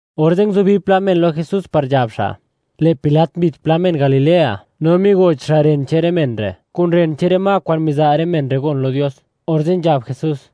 Orze' nguzubi pla men lo Jesús par nzhab xa': “Lë' Pilat mbit pla men Galilea, no migoch xa' ren che'n rë men re', kun ren che'n rë ma, kwa'n miza' rë men re' gon lo Dios.” Orze' nzhab Jesús: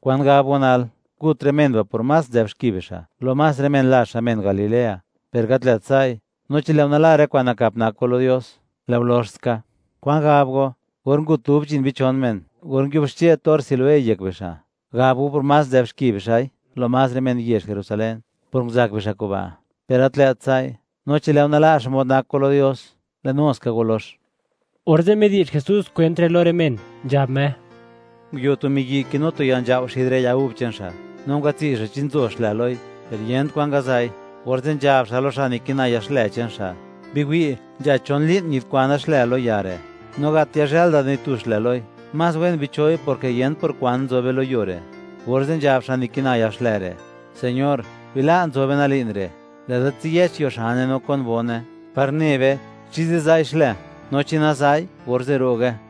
―¿Kwan gab go nal? Ngut rë men ba' por más nzë'b xki bixa', lo más rë men lazh xa', men Galilea. Per gat lë't sa'i. No chi lë' go nala' rë kwa'n nakap nak go lo Dios, lë' go lox ska. ¿Kwan gab go?, or ngut dub chi'n bichon men, or nguiuxche torr Siloé yek bixa', ¿gab go por más nzë'b xki bixa'i, lo más rë men yezh Jerusalén, por nguzak bixa' kuba'? Per gat lë't sa'i. No chi lë' go nala' xmod nak go lo Dios, lë' nu ska go lox. Orze' midi'zh Jesús kwent re' lo rë men, nzhab Me: ―Nguio tu miyi' kinu tu ya nzhao' xid rë ya gub che'n xa', no ngwatsi' xa' chi nzo xlë loi, per yent kwan ngaza'i. Orze' nzhab xa' lo xa' nikina ya xlë che'n xa': “Biwi', nzha chon li'n, ñidkwana xlë lo ya re', no gat yazhël da ni tu xlë loi. Más wen bicho'i, porke yent por kwan nzobe lo yuo re'.” Orze' nzhab xa' nikina ya xlë re': “Señor, bila' nzobe nal li'n re', lë'da tsiyëch yuo xane, no kon bone, par ne be chi ziza'i xlë. No chi naza'i, orze' ro'ge.”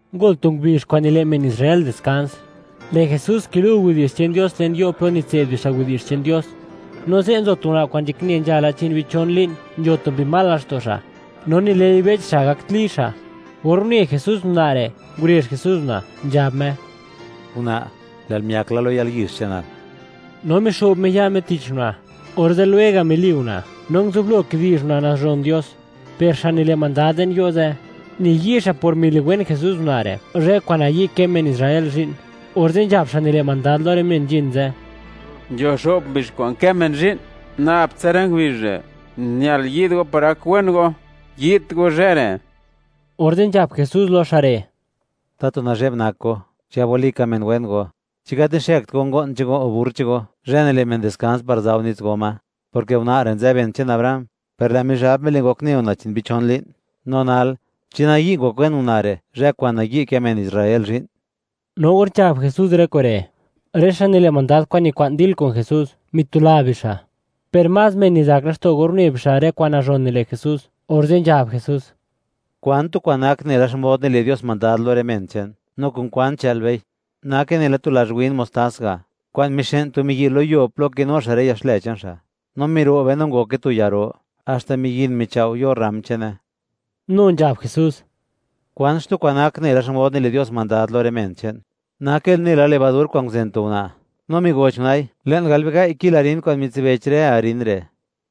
Ngol tu ngubizh, kwa'n nile' men Israel diskans, lë' Jesús kilu' widi'zh che'n Dios le'n yo' plo nitse'd bixa' widi'zh che'n Dios. No ze' nzo tu una' kwa'n nzhakne nzhala chi'n bichon li'n, nzho tu mbi mal laxto' xa', no nile'i bech xa', gakt li xa'. Or une Jesús una' re', ngurezh Jesús una', nzhab Me: ―Una', lë'l miak la lo yalyizh che'nal. No mixo'b Me ya' Me tich una', orze' lwega' mili una', no nguzublo kidi'zh una' nazhon Dios. Per xa' nile' mandad le'n yo' ze', niyi' xa' por miliwen Jesús una' re', zhë kwa'n nayi' kë men Israel zhi'n, orze' nzhab xa' nile' mandad lo rë men nzhin ze': ―Nzho xo'p ngubizh kwa'n kë men zhi'n, nab tsa rë ngubizh re' ñal yi'd go par gak wen go; yi'dt go zhë re'. Orze' nzhab Jesús lo xa' re': ―¡Tatu nazhe'b nak go, chigab walika men wen go! ¿Chi gat nixëkt go ngo'n che'n go, o burr che'n go zhë nile' men diskans, par za' go nits go ma?, porke una' re' nzë ben che'n Abraham, per lë' Mizhab mile' ngokne una' chi'n bichon li'n; no nal, ¿chi nayi' ngok wen una' re', zhë kwa'n nayi' kë men Israel zhi'n? No or nzhab Jesús rë kure', rë xa' nile' mandad kwa'n nikwa'n dil kun Jesús, mitula bixa', per más men mizak laxto' or une bixa', rë kwa'n nazhon nile' Jesús. Orze' nzhab Jesús: ―¿Kwan tu kwa'n nak nela xmod nile' Dios mandad lo rë men che'n Me, no kun kwan chë'l bei? Nake nela tu lazh win mostás ga', kwa'n mixë'n tu miyi', lo yuo plo kinu xa' rë ya xlë che'n xa', no miro'be, no ngoke tu ya ro, haxta miyin michao' yo rram che'ne. Nu nzhab Jesús: ―¿Kwan xtu kwa'n nak nela xmod nile' Dios mandad lo rë men che'n Me? Nake nela levadur kwa'n nguzen tu una', no migoch una'i, le'n gal biga'i kil harín kwa'n mitsibech rë harín re'.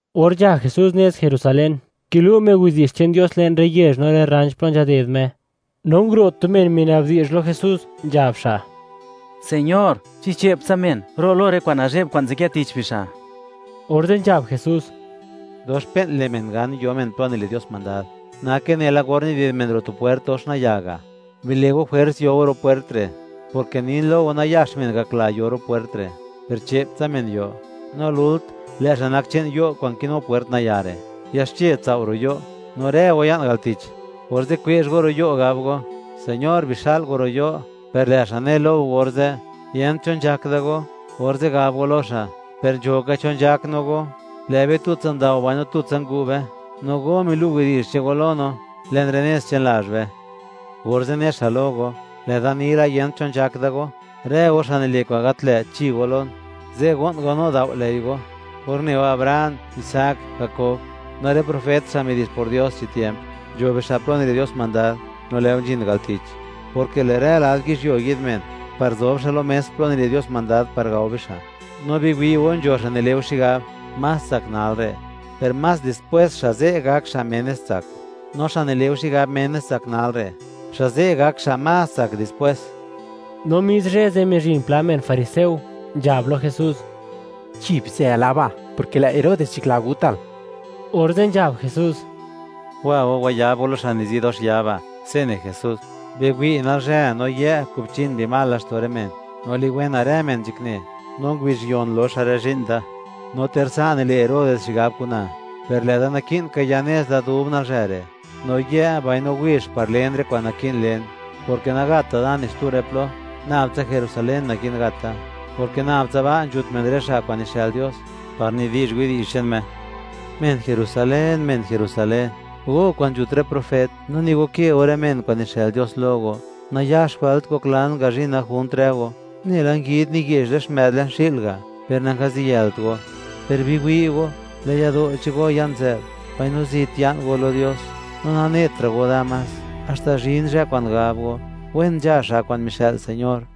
Or nzha Jesús nez Jerusalén, kilu' Me widi'zh che'n Dios le'n rë yezh, no rë rranch plo nzhaded Me, no nguro' tu men minabdi'zh lo Jesús, nzhab xa': ―Señor, ¿chi che'p tsa men ro' lo rë kwa'n nazhe'b kwa'n nzadkë tich bixa'? Orze' nzhab Jesús: ―Dox pe'n le' men gan, yo men plo nile' Dios mandad. Nake nela or nided men ro' tu pwert dox nayaa ga'. Bile' go jwers, yo go ro' pwert re', porke nin lo go, nayax men gakla yo ro' pwert re', per che'p tsa men yo. No lult, lë' xa' nak che'n yo' kwa'n kinu pwert nayaa re', yaxche tsao' ro' yo', no rë go ya'n al tich, orze' kwezh go ro' yo', gab go: “Señor, bixa'l go ro' yo'”, per lë' xa' ne lo go orze': “Yent cho nzhak da go.” Orze' gab go lo xa': “¡Per nzho ka cho nzhak no go! Lë' be tutsa ndao, mbaino tutsa ngu' be, no go milu' widi'zh che'n go lo no, le'n rë nez che'n lazh be.” Orze' ne xa' lo go: “Lë'da ni la, yent cho nzhak da go; ¡rë go xa' nile' kwa'n gat lë', chi go lon!” Ze' go'n go, no dao' ley go or ne go Abraham, Isaac, Jakob, no rë profet xa' midi'zh por Dios chi tiemp, nzho bixa' plo nile' Dios mandad, no lë' go nzhin al tich, porke lë' rë lad yizhyuo, yi'd men, par zob xa' lo mes, plo nile' Dios mandad par gao bixa'. No biwi' go, nzho xa' nile' go xigab, más tsak nal re', per más dispwés, xa' ze' gak xa' menes tsak; no xa' nile' go xigab menes tsak nal re', xa' ze' gak xa' más tsak dispwés. No mis zhë ze', mizhin pla men fariseo, nzhab lo Jesús: ―Chi, bizë laba'; porke lë' Herodes nzhakla gutal. Orze' nzhab Jesús: ―Wa go wayab go lo xa' nizi dox ya ba', se' ne Jesús: “Biwi', nalzhë, no yë', kubchin mbi mal laxto' rë men, no liwena rë men nzhakne; no ngubizh yon loxa rë zhi'n da.” No ter sa' nile' Herodes xigab kun na, per lë'da naki'n ka ya nez da dub nalzhë re', no yë' mbaino wizh par len rë kwa'n naki'n len; porke nagatta' da ni xtu rë plo, nab tsa Jerusalén naki'n gat da, porke nab tsa ba', nzhut men rë xa' kwa'n nixë'l Dios par nidi'zh widi'zh che'n Me. ’¡Men Jerusalén, men Jerusalén, go kwa'n nzhut rë profet, no nigo ke go rë men kwa'n nixë'l Dios lo go! ¡Nayax wëlt ngoklan ngazhina junt rë go, nela nguid niye'zh rë xmë'd le'n xi'l ga', per nangaziyëlt go! Per biwi' go, lë' yado' che'n go ya'n nzë'b, mbaino zit ya'n go di lo Dios; no nanetra' go da más, haxta zhin zhë kwa'n gab go: “¡Wen nzha xa' kwa'n mixë'l Señor!”